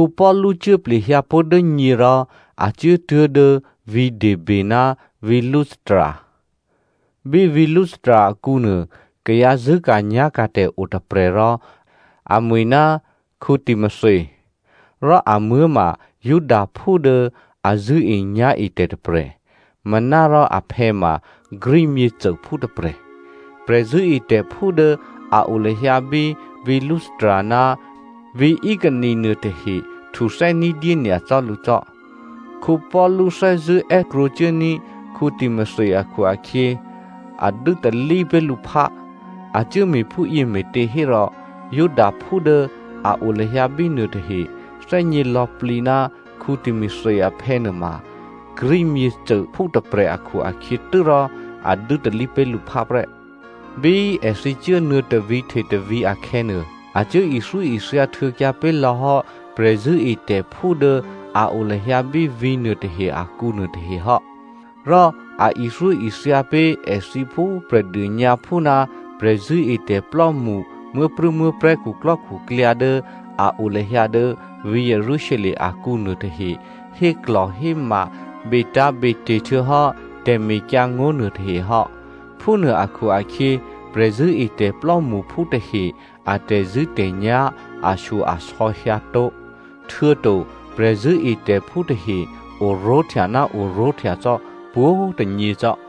Paulu cuố plehyǎ pó̤ dố nyě rò a cuốtuố̤ dố vǐ̤ Derbe ná vǐ̤ Lystra. Bí vǐ̤ Lystra akǔnuô, kayǎ zṳ̂́ka̤nyá̤ka̤tè̤ otôprè̤ rò amwi̤ ná Timothy. Rò amuố̤ ma Judaphú dố a zṳ̂́enyá̤etè̤ tôprè̤, manárò aphè̌ ma Greek myěcôphú tôprè̤. Prè̤zṳ̂́etè̤phú dố a o lahyǎ bí vǐ̤ Lystra ná vǐ̤ Iconio nuôtahe htuthè́ ní̤dyé nyacò́ lǔ cò́. Paulu thè́zṳ̂́ è́krwǒcuốní̤ Timothy akhu-akhyě, a dû́talí pé̤ lǔ phá. A cuốme̤ phúyě me̤těhérò, Judaphú dố a o lahyǎ bínuôtahe thè́gně lò̌plǐ ná Timothy aphè̌ nuôma Greek myěcôphú tôprè̤ akhu-akhyě tû́rò a dû́talí pé̤ lǔ phá prè́. Bí èthǐ cuố nuô̌tôvǐ̤ htetôvǐ̤ akhè̌nuô, a cuố ithyóithya htuô̌kyǎ pé̤ lò̌ hò́ prè̤zṳ̂́etè̤phú dố a o lahyǎ bí vǐ̤ nuôtahe akǔ nuôtahe hò́. Rò a ithyóithya pé̤ èthǐ phú Prè̤dônyǎphú ná prè̤zṳ̂́etè̤plò́mṳ muố̤prû̌muố̤prè̤́ khuklò́khuklyǎ dố a o lahyǎ dố vǐ̤ Jerusalem akǔ nuôtahe héklò̤héma betǎ̤bete̤ htuô̌hò́ tè̤mekyǎngó̤ nuôtahe hò́. Phúnuô akhu-akhyě, prè̤zṳ̂́etè̤ plò́mṳphú tahe a tè̤zṳ̂́tè̤nyá̤ ashyo-asò̌ hyǎtó̤, htuô̌to prè̤zṳ̂́etè̤phú tahe oró̤htya ná oró̤htya cò́ pwǒ̤꤮ tônyěcò́.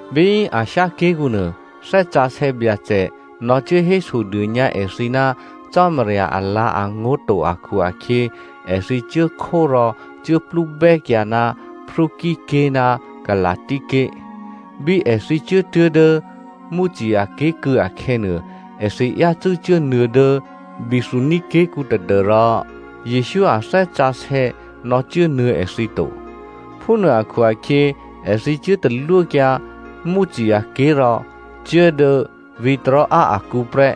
Bí Asia ké̤kǔ nuô Thè́ Sǎsè̌ Byacè nò̌cuố hésodônyǎ èthǐ ná Cò́marya alǎ̤angó̤ to akhu-akhyě èthǐ cuốkhó rò cuốplúbè́kyǎ ná Phrygia ké̤ ná Galasia ké̤. Bí èthǐ cuốtuố̤ dố Mysia ké̤kû̌ akhè̌nuô, èthǐ yácû́ cuốnuô̌ dố Bithynia ké̤kǔ tadû́rò Jesǔ a Thè́ Sǎsè̌ nò̌cuốnuô̌ èthǐ to. Phúnuô akhu-akhyě, èthǐ cuố talwókyǎ Mysia ké̤ rò cuố dố vǐ̤ Troa akǔ prè́.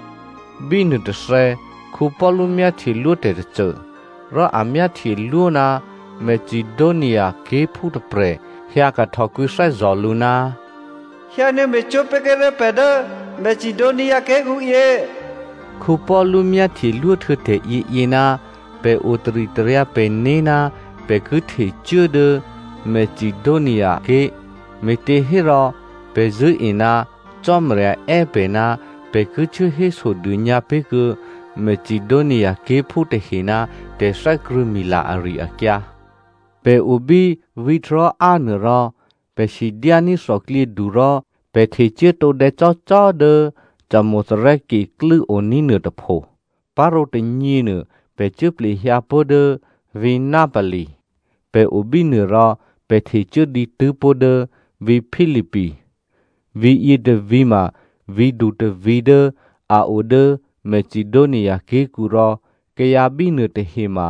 Bínuôtôthè̌, Paulu myáhtyelwó tè̤tôcô. Rò a myáhtyelwó ná Macedonia ké̤phú tôprè̤ hyǎkahtò kwǐthè́zò̤ lǔ, “Hyǎnuô̌ me̤cwó̤ pé̤kuô̌ré̤ pè̤ dố Macedonia ké̤kǔyě.” Paulu myáhtyelwó htuô̌ tè̤ yěyě, pè̤ otaritaryǎ pè̤né̤ ná pè̤ ki htecuố dố Macedonia ké̤, me̤těhérò pè̤ zṳ̂́e ná Cò́marya è́ pè̤ ná pè̤ ki cuố hésodônyǎ pé̤kuô̌ Macedonia ké̤phú tahe ná tè̤thè́krṳ̂̌mila ari-akyǎ. Pè̤ o bí vǐ̤ Troa nuô rò pè̤ sidyání̤ thòklyědu rò pè̤ htecuố tǒdè̌ cò́cò́ dố Samothrace klû́ oní̤ nuôtôpho, parǒ tônyěnuô, pè̤ cuố plehyǎ pó̤ dố vǐ̤ Neapoli. Pè̤ o bínuô rò, pè̤ htecuố dǐtû́pó̤ dố vǐ̤ Philippi. Vǐ̤yě tôvǐ̤ ma vǐ̤du tôvǐ̤ dố a o dố Macedonia ké̤kǔ rò kayǎ bínuô tahe ma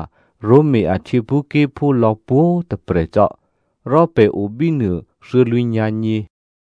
Roma a htyěphúké̤phú lò̌ pwǒ̤꤮ tôprè̤ cò́. Rò pè̤ o bínuô thuô̌lwǐ̤nyǎ̤nyě.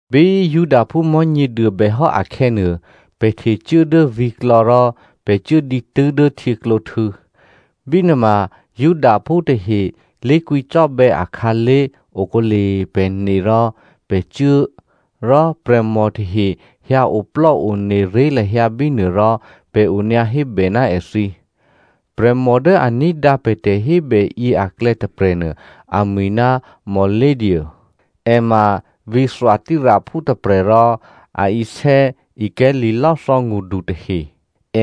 Bí Judaphú Mò̤́nyěduô bèhò́ akhè̌nuô, pè̤ htecuố dố vǐ̤klò̌ rò pè̤ cuố dǐtû́ dố htyěklǒhtû̌. Bínuôma Judaphú tahe lé̤kwǐcò́bè̌ akhǎlé̤ okǒle pè̤ ne rò pè̤ cuố꤮, rò prè̤mò tahe hyǎoplò́ one ré̤ lahyǎ bínuô rò pè̤ onyǎhébè ná èthǐ. Prè̤mò dố a ní̤dǎ pè̤ tè̤hébè yě aklè̌ tôprè̤nuô, amwi̤ ná Lydia, è ma vǐ̤ Thyatiraphú tôprè̤ rò a isè̌ ikè̤̌ li̤lò́thò̌ ngṳdu tahe.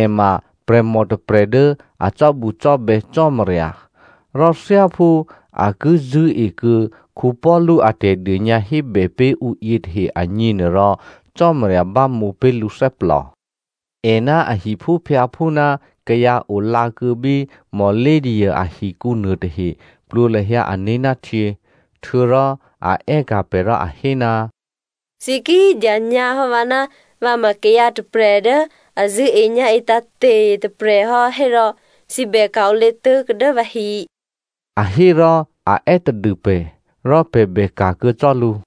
È ma prè̤mò tôprè̤ dố a cò́bucò́bè̌ Cò́marya. Rò thyáphú a ki zṳ̂́ekuô̌ Paulu a tè̤dônyǎhébè pé̤ ǔ yětahe agněnuôrò, Cò́marya bámǒ pé̤ lǔthè́plò. È ná a hiphúphyǎphú ná kayǎ o lǎkuô̌ bí Lydia ahikǔ nuôtahe plwǒ lahyǎ ané̤ ná htyě. Htuô̌rò a è́ka̤ pè̤ rò a hé, “Thǐ ki dyanyǎhò́ vǎ ná vǎ ma kayǎ tôprè̤ dố a zṳ̂́enyá̤e tǎ̤te̤ tôprè̤ hò́ hérò thǐ bè ka̤-olě tuố̤kuô̌ dố vǎhi,” a hé rò a è́tadû pè̤, rò pè̤ bè ka̤kuô̌ cò́ lǔ.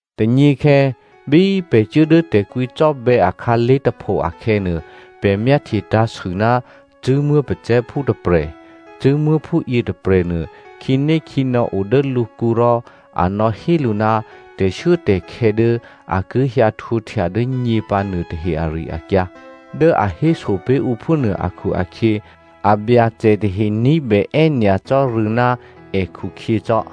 Tônyěkhè̌ bí pè̤ cuố dố tè̤kwǐcò́bè̌ akhǎlé̤ tôpho akhè̌nuô, pè̤ myáhtye tǎ̤sû ná cṳ̂́muố̤ pacè̤̌phú tôprè̤, cṳ̂́muố̤phú yětôprè̤nuô khǐnékhǐnò̌ o dố lǔkǔ rò a nò̌hé lǔ, tè̤shuốtè̤khè̌ dố a ki hyǎhtwǒhtya dố nyě pǎ nuôtahe ari-akyǎ. Dố a héso pé̤ ǔ phúnuô akhu-akhyě abyacè tahe ní̤bè è́nyacò́ rû̌ ná èkhukhyě cò́.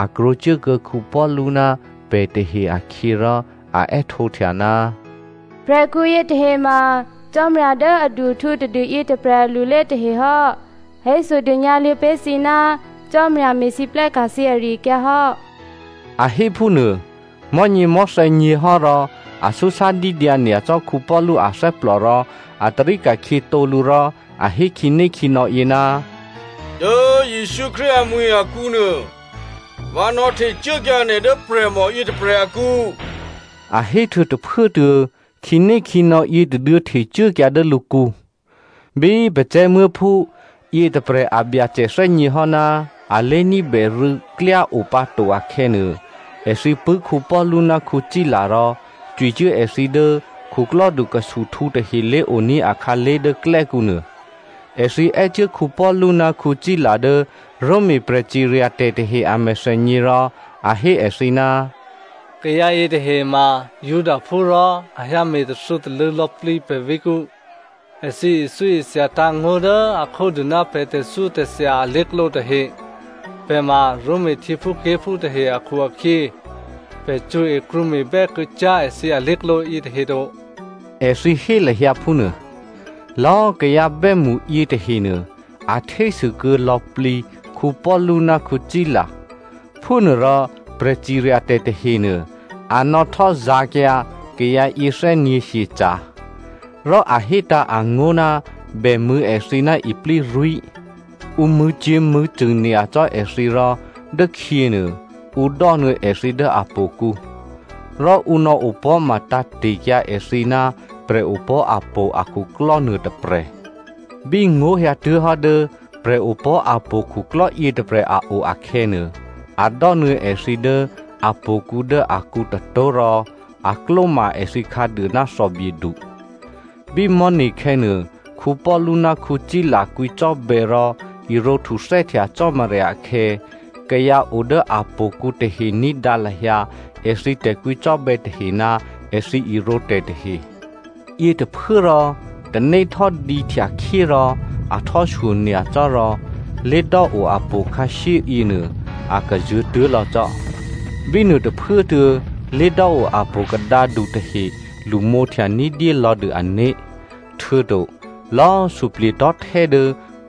A krwǒcuốkuô̌ Paulu ná pè̤ tahe akhyě rò, a è́htǒhtya, “Prè̤khǔ yětahe ma Cò́marya dố adu-ahtǔ tadû yětôprè̤ alulé tahe hò́. A hésodônyǎ luô̌ pé̤ thǐ ná Cò́marya me̤lwóhteka̤ thǐ ari-akyǎ hò́.” A hé phúnuô mò̤́nyěmò̤́thè̌ nyě̤hò́ rò a súsádídyǎ nyacò́ Paulu athè́plò rò a tarí ka̤khyětǒ lǔ rò a hé khǐnékhǐnò̌yě, “Dố Jesǔ Krístu amwi̤ akǔnuô, vǎ nò̌htecuốkyǎ nè̤ dố prè̤mò yětôprè̤ akǔ,” a héhtuô̌ tôphuốtuô̌ khǐnékhǐnò̌ yětôduô̌ htecuốkyǎ dố lǔkǔ. Bí pacè̤̌muố̤phú yětôprè̤ abyacè thè́gněhò́ ná a lé̤ní̤bèrû̌ klyá o pǎto akhè̌nuô, èthǐ pṳ̂́ Paulu ná Sila rò cwicuố èthǐ dố khuklò́du khusuhtǔ tahe lé̤oní̤ akhǎlé̤ dố klè́kǔ nuô. Èthǐ è́cuố Paulu ná Sila dố Roma prè̤ciryatè̤ tahe a mèthènyě rò a hé èthǐ, “Kayǎ yětahe ma Judaphú rò a hyǎme̤ tathû̌talṳ̂̌ lò̌plǐ pè̤ vǐ̤kǔ. Èthǐ ithyóithyatǎ̤ ngó̤ dố a khódû ná pè̤ tè̤thyótè̤thya alé̤klǒ tahe. Pè̤ ma Roma htyěphúké̤phú tahe akhu-akhyě, pè̤ cṳ̌e, krwǒme̤bè́ kuô̌cyá̤ èthǐ alé̤klǒ yětahe to,” èthǐ hé lahyǎ phúnuô. Lò̌꤮ kayǎ bè́mṳ yětahenuô a htésû kuô̌ lò̌plǐ Paulu ná Sila. Phúnuôrò prè̤ciryatè̤ tahenuô, a nò̌htò́zǎ̤kyǎ kayǎ yěthè́nyě̤ hyeca̤, rò a hétǎ̤ angó̤ ná bèmṳ̂̌ èthǐ ná iplírwí̤. Ǔ mṳ̂̌cyě̤mṳ̂̌cṳ̂ nyacò́ èthǐ rò dốkhyěnuô, ǔ dò́nuô̌ èthǐ dố htò̌kǔ, rò ǔ nò̌ opò̤́ma tǎ̤te̤kyǎ èthǐ ná prè̤opò̤́ htò̌ akhuklò́ nuôtôprè̤. Bí ngó̤ hyǎtuố̤hò́ dố prè̤opò̤́ htò̌ khuklò́ yětôprè̤ a o akhè̌nuô, a dò́nuô̌ èthǐ dố htò̌kǔ dố akǔ tôtó̤ rò a klóma èthǐ khǎduô ná thòbyedu. Bí mò̤́ne̤khè̌nuô, Paulu ná Sila kwǐcò́bè̌ rò irǒ htuthè́htya Cò́marya akhè̌, kayǎ o dố htò̌kǔ tahe ní̤dǎ lahyǎ èthǐ tè̤kwǐcò́bè̌ tahe ná èthǐ irǒtè̤ tahe. Yětôphuốrò tanéhtò́dǐ htyakhyé rò a htò́ shyonyacò́ rò lé̤dò́ o htò̌ khǎshyé yěnuô a kazuô̤̌tuố̤ lò̌ cò́. Bínuô tôphuốtuô̌, lé̤dò́ o htò̌ kadǎdu tahe lṳmǒhtya ní̤dyé lò̌dû ané̤. Htuô̌to lò̌꤮ suplye̤tò̤́htè́ dố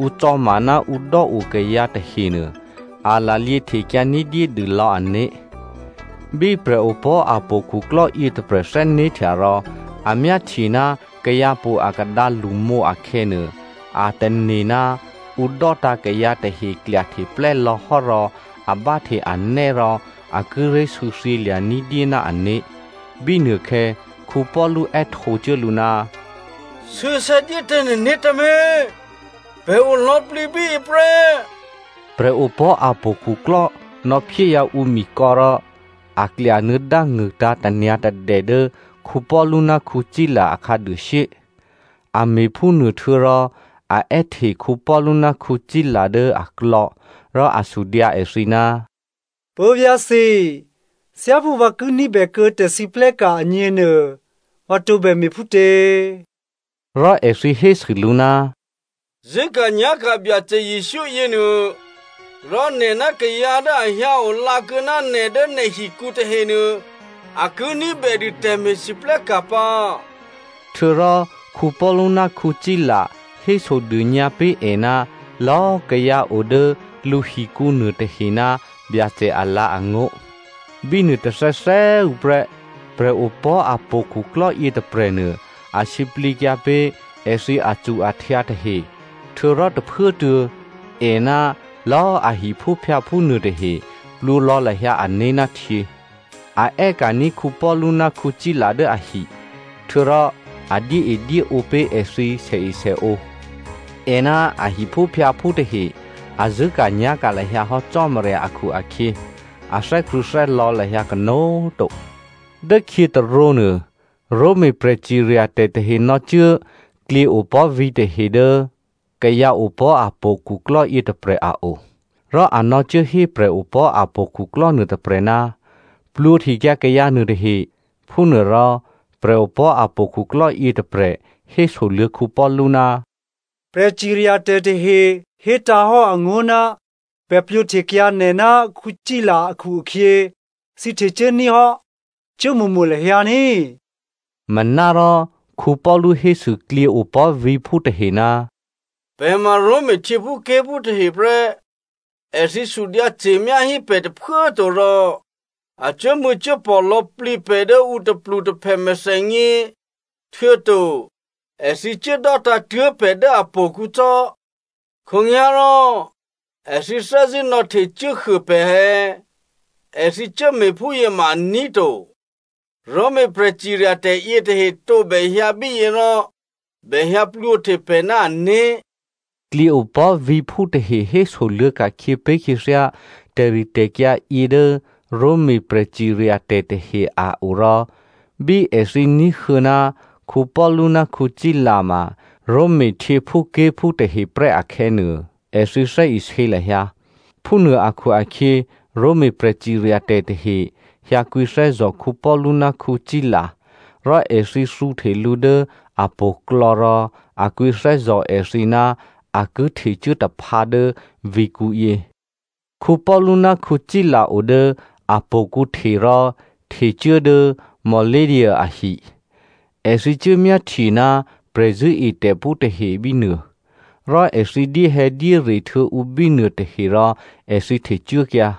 ǔ cò̌ma ná ǔ dò́o kayǎ tahenuô, a lalyě htekyǎ ní̤dyédû lò̌ ané̤. Bí prè̤opò̤́htò̌ khuklò́ yětôprè̤ thè́né̤htya rò a myáhtye ná kayǎhtò̌ akadǎ lṳmǒ akhè̌nuô, a tane̤ ná ǔ dò́tǎ̤ kayǎ tahe klyahteplè́ lò̌hò́ rò a báhte anè́ rò a kíré̤ sû̌thyělya̤ ní̤dyé ná ané̤. Bínuôkhè̌ Paulu è́htǒcuố lǔ, “Sû̌sè̌ dyétǎ nè̤né̤ tǎmé̤. Pè̤ o lò̌plǐ bíyě prè́.” Prè̤opò̤́htò̌ khuklò́ nò̌phyéhyǎ ǔ mikò̌ rò a klyanuô̌ dángṳ̂tǎ̤ tanyǎ̤tadè dố Paulu ná Sila a khǎduôshyé. A me̤phúnuô htuô̌rò a è́hte Paulu ná Sila dố aklò̌ rò a sudyǎ èthǐ, “Puố̤vyá̤ thǐ꤮, thyáphú vǎ ki ní̤bèkuô̌ tè̤siplè́ka̤ agněnuô, vǎ tǒbè me̤phútě?” Rò èthǐ hésû lǔ, “Zṳ̂́ka̤nyá̤ka̤ Byacè Jesǔ yěnuô, rò nè̤ ná kayǎ dố a hyǎ olǎkuô̌ ná nè̤ dố nè̤hikǔ tahenuô, a ki ní̤bè dû tè̤me̤lwóhteka̤ pǎ.” Htuô̌rò Paulu ná Sila hésodônyǎ pé̤ è ná lò̌꤮ kayǎ o dố lǔhikǔ nuôtahe ná Byacè alǎ̤angó̤. Bí nuôtôthè̌thè̌꤮ tuô̌ prè́, prè̤opò̤́htò̌ khuklò́ yětôprè̤nuô a sǐplǐkyǎ pé̤ èthǐ acu-ahtyǎ tahe, htuô̌rò tôphuốtuô̌ è ná lò̌꤮ a hiphúphyǎphú nuôtahe plwǒ lò̌ lahyǎ ané̤ ná htyě. A è́ka̤ní̤ Paulu ná Sila dố ahi, htuô̌rò a dyéedyéǒ pé̤ èthǐ sèesèǒ. È ná a hiphúphyǎphú tahe a zṳ̂́ka̤nyá̤ka̤ lahyǎ hò́ Cò́marya akhu-akhyě, a thè́krṳ̂̌thè́lò̌ lahyǎ kanó̤꤮ to. Dốkhyě tôrǒnuô, Roma prè̤ciryatè̤ tahe nò̌cuố klyěopò̤́ vǐ̤ tahe dố kayǎopò̤́htò̌ khuklò́ yětôprè̤ a o. Rò a nò̌cuốhé prè̤opò̤́htò̌ khuklò́ nuôtôprè̤, “Plwǒhtekyǎ kayǎ nuôtahe.” Phúnuô rò, prè̤opò̤́htò̌ khuklò́ yětôprè̤ hésoluô̌ Paulu, “Prè̤ciryatè̤ tahe hétǎ̤hò́ angó̤ ná bèplwǒhtekyǎ nè̤ ná Sila akhu-akhyě, thǐ htecuố ní̤ hò́. Cuốmo̤mo̤ lahyǎ ní꤮.” Manárò Paulu hésû klyěopò̤́ vǐ̤phú tahe, “Pè̤ ma Roma htyěphúké̤phú tahe prè́. Èthǐ sudyǎce̤myá hí pè̤ tôphuố꤮ to rò a cuốmṳ̂̌cuốpò̤ lò̌plǐ pè̤ dố ǔ tôplutôphè mèthènyě, htuô̌to èthǐ cuốdò́tǎ̤ tuố̤ pè̤ dố htò̌kǔ cò́. Khǒnyá̤rò, èthǐ thè́zṳ̂́ nò̌htecuốhuô pè̤ è̌? Èthǐ cuốme̤phúyě ma aní̤ to. Roma prè̤ciryatè̤ yětahe tǒbè hyǎ bíyě rò bèhyǎplwǒhte pè̤ ná ané̤.” Klyěopò̤́ vǐ̤phú tahe hésoluô̌ ka̤khyě pé̤ khyěthyá tè̤ritè̤kyǎ yě dố Roma prè̤ciryatè̤ tahe a o rò bí èthǐ ní̤huô̌ ná Paulu ná Sila ma Roma htyěphúké̤phú tahe prè́ akhè̌nuô, èthǐ thè́isě lahyǎ. Phúnuô akhu-akhyě, Roma prè̤ciryatè̤ tahe hyǎ kwǐthè́zò̤ Paulu ná Sila rò èthǐ thǔhte lǔ dố htò̌klò̌ rò a kwǐthè́zò̤ èthǐ ná a ki htecuốtaphǎ dố vǐ̤kǔ yě. Paulu ná Sila o dố htò̌kǔ hte rò htecuố dố Lydia ahi. Èthǐ cuốmyáhtye ná prè̤zṳ̂́etè̤phú tahe bínuô. Rò èthǐ dyéhè̌dyére htuô̌ ǔ bínuô tahe rò èthǐ htecuốkyǎ.